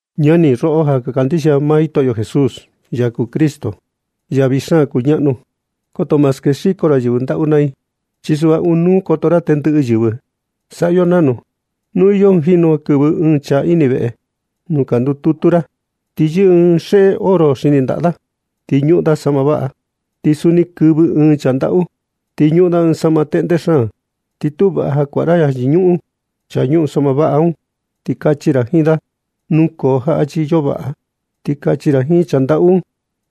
Ñani, roꞌo ja ka kandixia maa Jitoꞌo Jesús, ya kuu Cristo, ya vii xaan kuñaꞌnu. Koto ma skexiko ra yɨvɨ ndaꞌu naa i, chi suꞌva ɨɨn nuu koto ra tendɨꞌɨ yɨvɨ. Saꞌa yo nanu. Nu iyo jinu ja kɨvɨ ɨɨn chaa ini veꞌe nuu ka ndututu ra, ti yɨꞌɨ ɨɨn xeꞌe oro xini ndaꞌa da, ti ñuꞌun da saꞌma vaꞌa. Ti suni kɨvɨ ɨɨn chaa ndaꞌu, ti ñuꞌun da ɨɨn saꞌma teꞌnde xaan. Ti tu vaꞌa ja kuaꞌa ra ja yɨñuꞌun chaa ñuꞌun saꞌma vaꞌa un, ti kachi ra jiin da: “Nukoo jaꞌa chi iyo vaꞌa.” Ti kachi ra jiin chaa ndaꞌu un: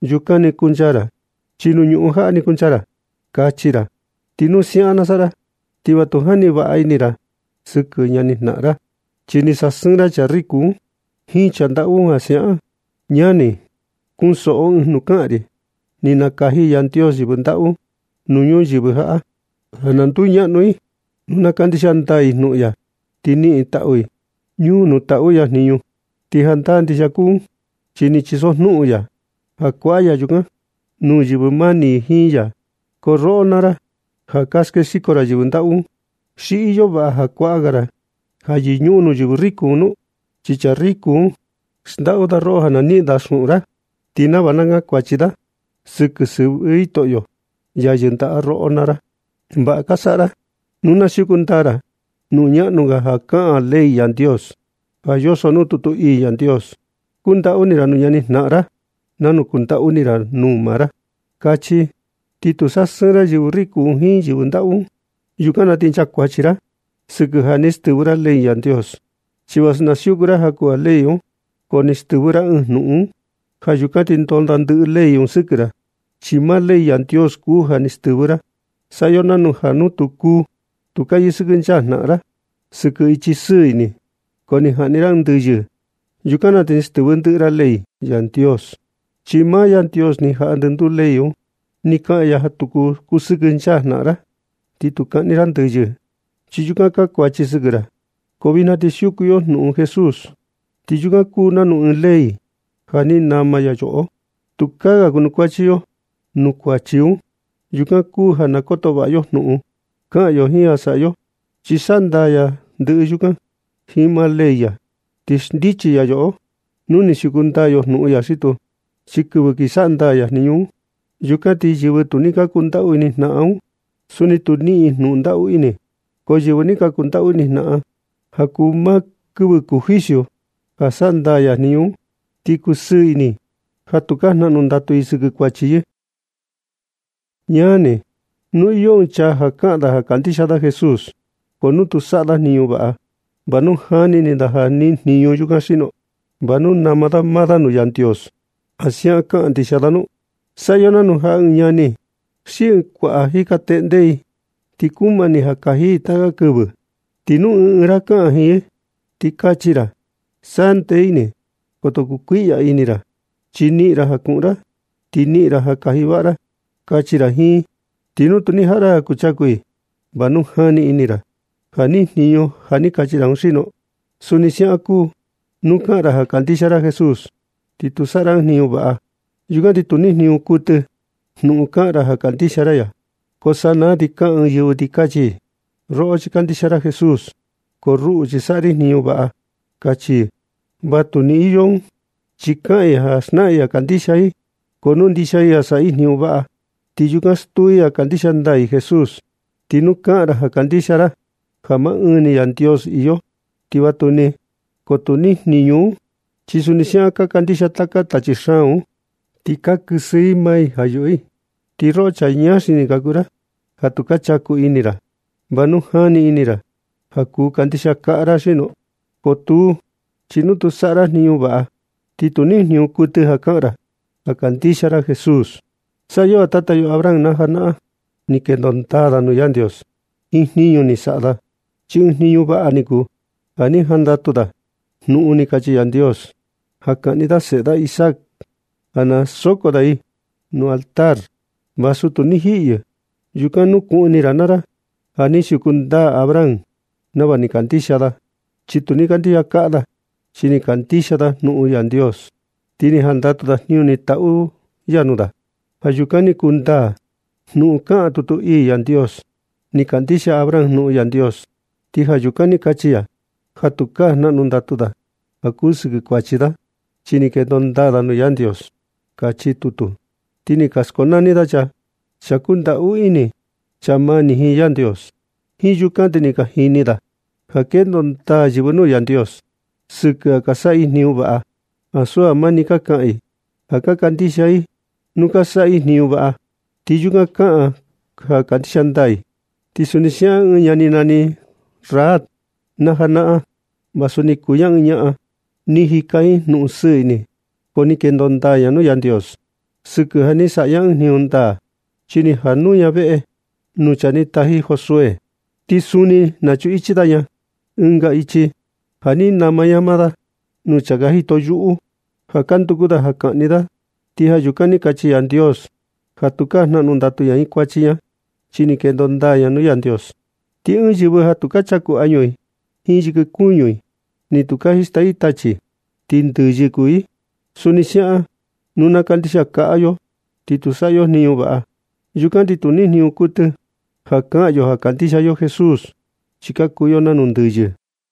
“Yukan ni kuncha ra, xi nuu ñuꞌun jaꞌa ni kuncha ra”, kachi ra. Ti nu siaꞌan na saꞌa ra, ti va tu jani vaꞌa ini ra sɨkɨ ñani jnaꞌan ra, chi ni sasɨɨn ra chaa riku un jiin chaa ndaꞌu un ja siaꞌan. Ñani, kunsoꞌo ɨɨn jnuꞌun na kaꞌan ri: Ni nakaji Yandios yɨvɨ ndaꞌu nuu ñuyɨvɨ jaꞌa ja na nduñaꞌnu i nuu na kandixia ndaa i jnuꞌun ya, ti niꞌin taꞌu i ñuu nuu taꞌu ya jniñu. Ti jandaa ndixia kuu un, chi ni chisojnuꞌun ya ja kuaꞌa ya yukan nuu yɨvɨ mani i jiin ya. Ko roꞌo naa ra, ja ka skexiko ra yɨvɨ ndaꞌu, ¿xi iyo vaꞌa ja kuaꞌa ga ra ja yɨñuꞌun nuu yɨvɨ riku nu? Chi chaa riku un, xndaꞌu da roꞌo sɨkɨ ja na niꞌin da xuꞌun ra, ti nava na kankuachi da sɨkɨ sɨvɨ Jitoꞌo, ya yɨndaꞌa roꞌo naa ra. Vaꞌa ka saꞌa ra nu ka siuku ndaa ra jnuꞌun ñaꞌnu ga ja kaꞌan ley Yandios, ja yoso nuu tutu ii ya: “Kundaꞌu ini ra nuu ñani jnaꞌan ra nanu kundaꞌu ini ra nuu maa ra”, kachi. Ti nu ka sasɨɨn ra yɨvɨ riku jiin yɨvɨ ndaꞌu, yukan na ti nchaa kuachi ra sɨkɨ ja ni stɨvɨ ra ley Yandios. Chi vasu ka siuku ra jaku ga ley un, ko ni stɨvɨ ra ɨɨn jnuꞌun un. Ja yukan ti ndondaa ndɨꞌɨ ley un sɨkɨ ra, chi maa ley Yandios kuu ja ni stɨvɨ ra. Saꞌa yo nanu ja nu tu ka yɨsɨkɨnchaa jnaꞌan ra sɨkɨ ichi sɨɨ ini, ko ni jaꞌni ra ɨɨn ndɨyɨ, yukan na ti ja ni stɨvɨ ndɨꞌɨ ra ley Yandios. Chi maa Yandios ni jaꞌa ndɨnduu ley un. Ni kaꞌan ya ja tu kusɨkɨnchaa jnaꞌan ra, ni tu kaꞌni ra ndɨyɨ. Chi yukan nchakuachi sɨkɨ ra. Ko vijna ti ka siuku yo jnuꞌun Jesús, ti yukan kuu nanu ɨɨn ley ja ni nama ya yoꞌo ja tukaa ga kuanukuachi yo nuu kuachi un. Yukan kuu ja na koto vaꞌa yo jnuꞌun kaꞌan yo jiin ja saꞌa yo, chi saꞌa ndaa ya ndɨꞌɨ yukan jiin maa ley ya, ti xndichi ya yoꞌo nu ni siuku ndaa yo jnuꞌun ya xi tuu. Chi kɨvɨ kin saꞌa ndaa ya jniñu un, yukan na ti yɨvɨ tu ni kundaꞌu ini jnaꞌan un, suni tu niꞌin i jnuꞌun ndaꞌu ini. Ko yɨvɨ ja ni kundaꞌu ini jnaꞌan, ti ja kuu maa kɨvɨ juicio ja saꞌa ndaa ya jniñu un, ti kusɨɨ ini i ja tukaa jnaꞌnu ndatu i sɨkɨ kuachi i. Ñani, nu iyo ɨɨn chaa kaꞌan ja kandixia da Jesús, ko nu tu saꞌa da jniñu vaꞌa, ¿va nu jani ini ra ja niꞌin jniñu yukan xino? ¿Va nu nama da maa da nuu Yandios ja siaꞌan kandixia da nu? Saꞌa yo nanu ja ɨɨn ñani xi ɨɨn kuaꞌa jika teꞌnde i, ti kumani ja kaji i taka kɨvɨ. Ti nu ɨɨn ra na kaꞌan jiin i ti kachi ra: “Saꞌa ndee ini. Koto kukuiꞌya ini ra, chi niꞌin ra ja kuꞌun ra, ti niꞌin ra ja kaji vaꞌa ra”, kachi ra jiin i. Ti nu tu ni jaꞌa ra ja kuchaku i, ¿va nu jani ini ra ja niꞌin jniñu ja ni kachi ra un xino? Suni siaꞌan kuu nu kaꞌan ra ja kandixia ra Jesús, ti nu tu saꞌa ra ɨɨn jniñu vaꞌa, yukan ti tu niꞌin jniñu kuɨtɨ jnuꞌun kaꞌan ra ja kandixia ra ya. Ko sanaa ti kaꞌan ɨɨn yɨvɨ ti kachi: “Roꞌo chi kandixia ra Jesús, ko ruꞌu, chi saꞌa ri jniñu vaꞌa”, kachi i. Vatuni iyo un, chi kaꞌan i ja xnaꞌan i ja kandixia i, ko nu ndixia i ja saꞌa i jniñu vaꞌa, ti yukan stuu i ja kandixia ndaa i Jesús. Ti nu kaꞌan ra ja kandixia ra ja maa ɨɨn ni Yandios iyo, ti vatuni, ko tu nijniñu un, chi suni siaꞌan ka kandixia taka tachi xaan un, ti ka kɨsɨ i maa i ja ka yuꞌu i. Ti roꞌo chaa ñaa xini kuu ra, ja tu chaku ini ra, ¿va nu jani ini ra ja kuu kandixia kaꞌa ra xino? Ko tuu, chi nu tu saꞌa ra jniñu vaꞌa, ni tu niꞌin jniñu kuɨtɨ ja kaꞌan ra ja kandixia ra Jesús. Saꞌa yo ja tata yo Abraham na janaꞌan, ni kendo ndaa da nuu Yandios jiin jniñu ni saꞌa da, chi ɨɨn jniñu vaꞌa ni kuu ja ni jandatu da jnuꞌun ni kachi Yandios ja kaꞌni da seꞌe da Isaac ja na soko da yɨ nuu altar, vasu tu ni jiꞌi yɨ. Yukan nukuꞌun ini ra naa ra ja ni siuku ndaa Abraham nava ni kandixia da, chi tu ni kandixia kaꞌa da, chi ni kandixia da jnuꞌun Yandios, ti ni jandatu da jniñu ni taꞌu ya nuu da. Ja yukan ni kuu ndaa jnuꞌun ja kaꞌan tutu ii Yandios: “Ni kandixia Abraham jnuꞌun Yandios, ti ja yukan ni kachi ya ja tukaa jnaꞌnu ndatu da ja kuu sɨkɨ kuachi da, chi ni kendo ndaa da nuu Yandios”, kachi tutu. Ti ni ka skonani da chaa: chaa kundaꞌu ini, chaa mani jiin Yandios. Jiin yukan ti ni ka jini ra ja kendo ndaa yɨvɨ nuu Yandios sɨkɨ ja ka saꞌa i jniñu vaꞌa, ti ansu ja mani ka kaꞌan i ja ka kandixia i. Nu ka saꞌa i jniñu vaꞌa, ti yukan kuni kaꞌan ja ka kandixia ndaa i. Suni siaꞌan ɨɨn ñaꞌan ni nani Rahab na janaꞌan, vasu ni kuu ña ɨɨn ñaꞌan ni jika jiin jnuꞌun sɨɨ ini, ko ni kendo ndaa ña nuu Yandios sɨkɨ ja ni saꞌa ña ɨɨn jniñu ndaa. Chi ni jaꞌa nuu ña veꞌe nuu chaa ni taji Josué, ti suni ni nachuꞌun ichi ña da ɨnga ichi ja ni nama ña maa da nuu chaa ka jito yuꞌu ja ka nduku kaꞌni da. Ti ja yukan ni kachi Yandios ja tukaa jnaꞌnu ndatu ña jiin kuachi ña, chi ni kendo ndaa ña nuu Yandios. Ti ɨɨn yɨvɨ ja tukaa chaku añu i jiin yɨkɨ kuñu i, ni tukaa jista i tachi, ti ndɨyɨ kuu i. Suni siaꞌan, nu na kandixia kaꞌa yo ti tu saꞌa yo jniñu vaꞌa, yukan ti tu niꞌin jniñu kuɨtɨ ja kaꞌan yo ja kandixia yo Jesús, chi ka kuu yo nanu ndɨyɨ.